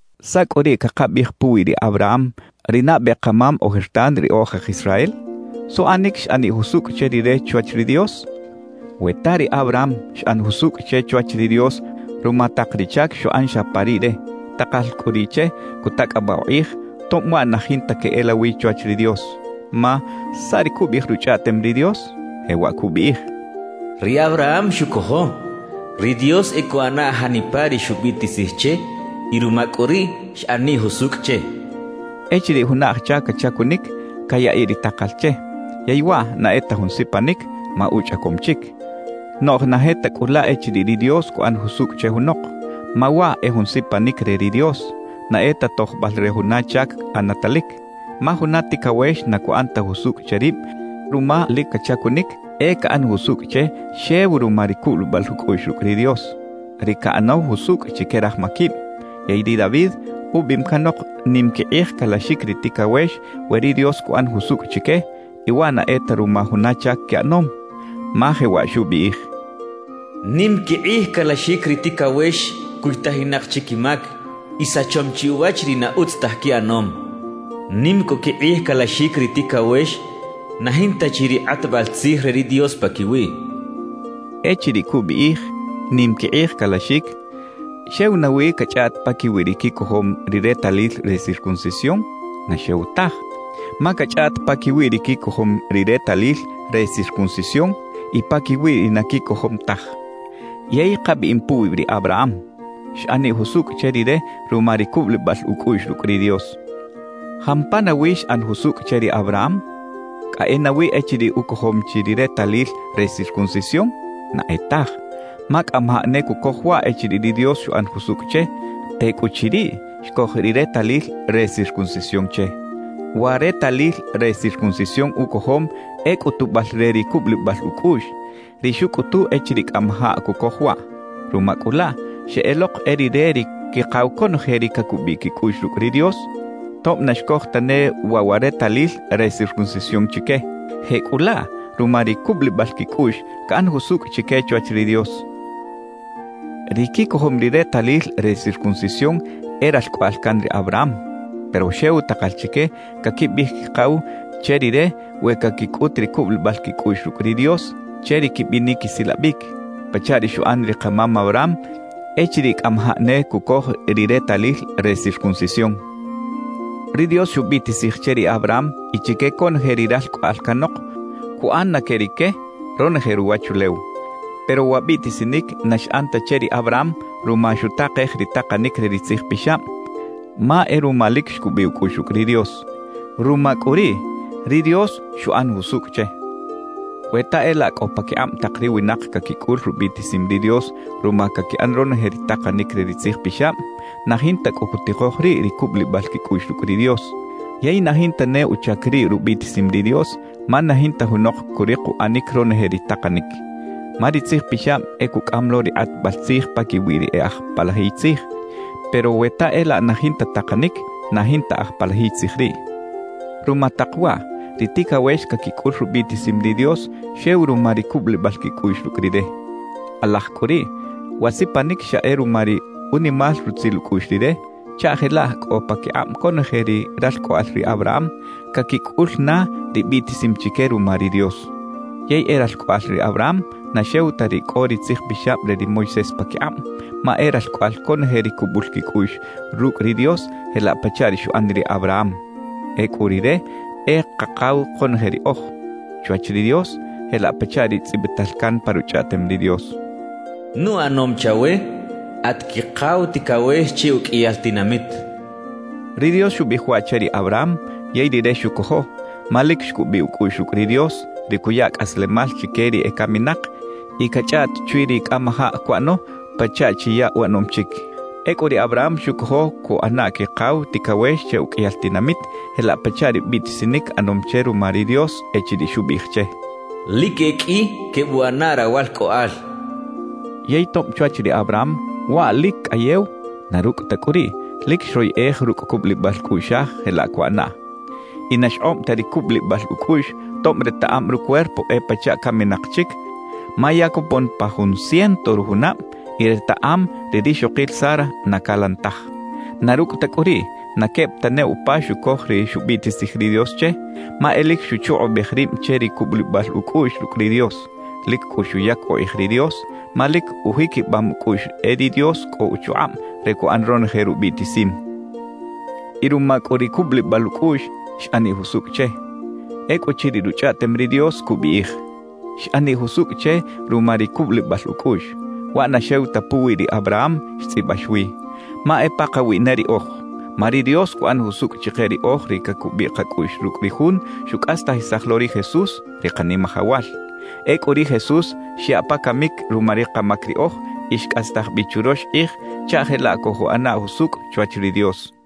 ¿Saꞌ cꞌu riꞌ cakabiꞌij puwi ri Abraham, ri nabe kamam ojertan ri oj aj Israel? ¿Suꞌanic xꞌaniꞌ jusucꞌ che rire chwach ri Dios? We ta ri Abraham xꞌan jusucꞌ che chwach ri Dios ruma tak ri chac xuꞌan xa pa riꞌre, takal cꞌu riꞌ che cutacꞌabaꞌ ukꞌij; tob waꞌ na jinta queꞌelawi chwach ri Dios. Ma ¿saꞌ ri cubiꞌij Ruchꞌaꞌtem ri Dios? Jewaꞌ cubiꞌij: Ri Abraham xucojo ri Dios e cuꞌana janipa ri xubiꞌtisij che y ruma cꞌu riꞌ xꞌaniꞌ jusucꞌ che cachaꞌ. Echiriꞌ juna aj chac cachacunic, cayaꞌiꞌ ri takal che; yey waꞌ na e ta jun sipanic, ma uchꞌacom chic. Noꞌj na je ta cꞌu laꞌ echiriꞌ ri Dios cuꞌan jusucꞌ che junok. Ma waꞌ e jun sipanic re ri Dios, na e ta tojbal re juna chac ꞌanatalic. Ma juna ticawex na cuꞌan ta jusucꞌ che rib ruma lic cachacunic; e caꞌan jusucꞌ che xew ruma ri cubulibal ucꞌuꞌx rucꞌ ri Dios, ri caꞌanaw jusucꞌ chique raj maquib. Yey ri David ubiꞌim canok nim quikꞌij calaxic ri ticawex we ri Dios cuꞌan jusucꞌ chique y waꞌ na e ta ruma juna chac quiꞌanom, ma jewaꞌ xubiꞌij: ¡Nim quikꞌij calaxic ri ticawex cuytajinak chi quimac y sachom chi uwach ri na utz taj quiꞌanom! ¡Nim cꞌu quikꞌij calaxic ri ticawex na jinta chi ri kꞌatbal tzij re ri Dios paquiwiꞌ! xchaꞌ. Echiriꞌ cubiꞌij «nim quikꞌij calaxic», ¿xew nawi cachꞌaꞌt paquiwi ri quicojom ri retalil re circuncisión? ¡Na xew taj! Ma cachꞌaꞌt paquiwi ri quicojom ri retalil re circuncisión y paquiwi ri na quicojom taj. Yey kabiꞌim puwi ri Abraham: Xꞌaniꞌ jusucꞌ che rire ruma ri cubulibal ucꞌuꞌx rucꞌ ri Dios. ¿Jampa nawi xꞌan jusucꞌ che ri Abraham? ¿Cꞌa e nawi echiriꞌ ucojom chi ri retalil re circuncisión? ¡Na e taj! Ma cꞌamajaꞌ ne cucoj waꞌ echiriꞌ ri Dios xuꞌan jusucꞌ che; tecꞌuchiriꞌ xcoj ri retalil re circuncisión che. Wa retalil re circuncisión ucojom e cꞌutubal re ri cubulibal ucꞌuꞌx, ri xucꞌutu echiriꞌ cꞌamajaꞌ cucoj waꞌ. Ruma cꞌu laꞌ, xeꞌelok e rire ri quikaw conoje ri cacubiꞌ quicꞌuꞌx rucꞌ ri Dios, tob na xcoj tane waꞌ wa retalil re circuncisión chique. Jecꞌulaꞌ, ruma ri cubulibal quicꞌuꞌx caꞌan jusucꞌ chique chwach ri Dios. Ri quicojom ri retalil re circuncisión e ralcꞌoꞌal can ri Abraham; pero xew takal chique caquibiꞌij quikaw che rire we caquicꞌut ri cubulibal quicꞌuꞌx rucꞌ ri Dios che ri quibinic quisilabic, pachaꞌ ri xuꞌan ri kamam Abraham echiriꞌ cꞌamajaꞌ ne cucoj ri retalil re circuncisión. Ri Dios xubiꞌtisij che ri Abraham y chique conoje ri e ralcꞌoꞌal canok, cuꞌan na que rique ronoje ruwachulew. Pero wa biꞌtisinic na xꞌan ta che ri Abraham ruma xutakej ri takanic re ri Tzij Pixab, ma e ruma lic xcubiꞌ ucꞌuꞌx rucꞌ ri Dios. Ruma cꞌu riꞌ, ri Dios xuꞌan jusucꞌ che. We ta e laꞌ cꞌo paquikꞌab tak ri winak caquicꞌul rubiꞌtisim ri Dios ruma caquiꞌan ronoje ri takanic re ri Tzij Pixab, na jinta cꞌu cutikoj riꞌ ri cubulibal quicꞌuꞌx rucꞌ ri Dios, yey na jinta ne uchac riꞌ rubiꞌtisim ri Dios, ma na jinta junok curik uꞌanic ronoje ri takanic. Ma ri Tzij Pixab e cucꞌam lo ri kꞌatbal tzij paquiwi ri e aj palajiy tzij. Pero we ta e laꞌ na jinta takanic, na jinta aj palajiy tzij riꞌ. Ruma tak waꞌ, ri ticawex caquicꞌul rubiꞌtisim ri Dios xew ruma ri cubulibal quicꞌuꞌx rucꞌ Rire. Kꞌalaj cꞌu riꞌ, wa sipanic xa e ruma ri unimal rutzil ucꞌuꞌx Rire, chaꞌ jelaꞌ cꞌo paquikꞌab conoje ri ralcꞌoꞌal ri Abraham caquicꞌul na ri biꞌtisim chique ruma ri Dios. Yey e ralcꞌoꞌal ri Abraham na xew ta ri cꞌo ri Tzij Pixab re ri Moisés paquikꞌab, ma e ralcꞌoꞌal conoje ri cubul quicꞌuꞌx rucꞌ ri Dios jelaꞌ pachaꞌ ri xuꞌan ri Abraham. Ecꞌu rire e kakaw konoje riꞌoj chwach ri Dios, jelaꞌ pachaꞌ ri tzꞌibital can pa Ruchꞌaꞌtem ri Dios: «Nuꞌanom chawe at quikaw ticawex che uqꞌuiyal tinamit» xchaꞌ. Ri Dios xubiꞌij waꞌ che ri Abraham, yey rire xucojo; ma lic xcubiꞌ ucꞌuꞌx rucꞌ ri Dios, ri cuya cꞌaslemal chique ri ecaminak y cachꞌaꞌt chwi ri cꞌamajaꞌ cuꞌano pachaꞌ chi ya uꞌanom chic. Ecꞌu ri Abraham xucojo cuꞌana quikaw ticawex che uqꞌuiyal tinamit jelaꞌ pachaꞌ ri biꞌtisinic ꞌanom che ruma ri Dios echiriꞌ xubiꞌij che: «Lic e qꞌui quebuꞌana rawalcꞌoꞌal.» Yey tob chwach ri Abraham waꞌ lic cꞌayew, na rucꞌ ta cꞌu riꞌ, lic xroyeꞌej rucꞌ cubulibal cꞌuꞌxaj jelaꞌ cuꞌanaꞌ. Y na xkꞌob ta ri cubulibal ucꞌuꞌx tob retaꞌam rucuerpo e pachaꞌ caminak chic ma ya copon pa jun ciento rujunab y retaꞌam ri rixokil Sara na calan taj. Na rucꞌ ta cꞌu riꞌ, na queb ta ne upa xucoj ri xubiꞌtisij ri Dios che, ma e lic xuchukꞌubej rib che ri cubulibal ucꞌuꞌx rucꞌ ri Dios. Lic cꞌu xuyac ukꞌij ri Dios, ma lic ujiquibam ucꞌuꞌx e ri Dios cꞌo uchukꞌab re cuꞌan ronoje rubiꞌtisim. Y ruma cꞌu ri cubulibal ucꞌuꞌx, xꞌaniꞌ jusucꞌ che. Ecꞌuchiriꞌ Ruchꞌaꞌtem ri Dios cubiꞌij: «Xꞌaniꞌ jusucꞌ che ruma ri cubulibal ucꞌuꞌx,» waꞌ na xew ta puwi ri Abraham xtzꞌibax wi; ma e pakawiꞌ ne riꞌoj. Ma ri Dios cuꞌan jusucꞌ chike riꞌoj ri cacubiꞌ kacꞌuꞌx rucꞌ ri Jun xucꞌastajisaj lo ri Jesús, ri Kanimajawal. Ecꞌu ri Jesús xyaꞌ pa camic ruma ri kamac riꞌoj y xcꞌastaj bi churox kꞌij chaꞌ jelaꞌ cojuꞌana jusucꞌ chwach ri Dios.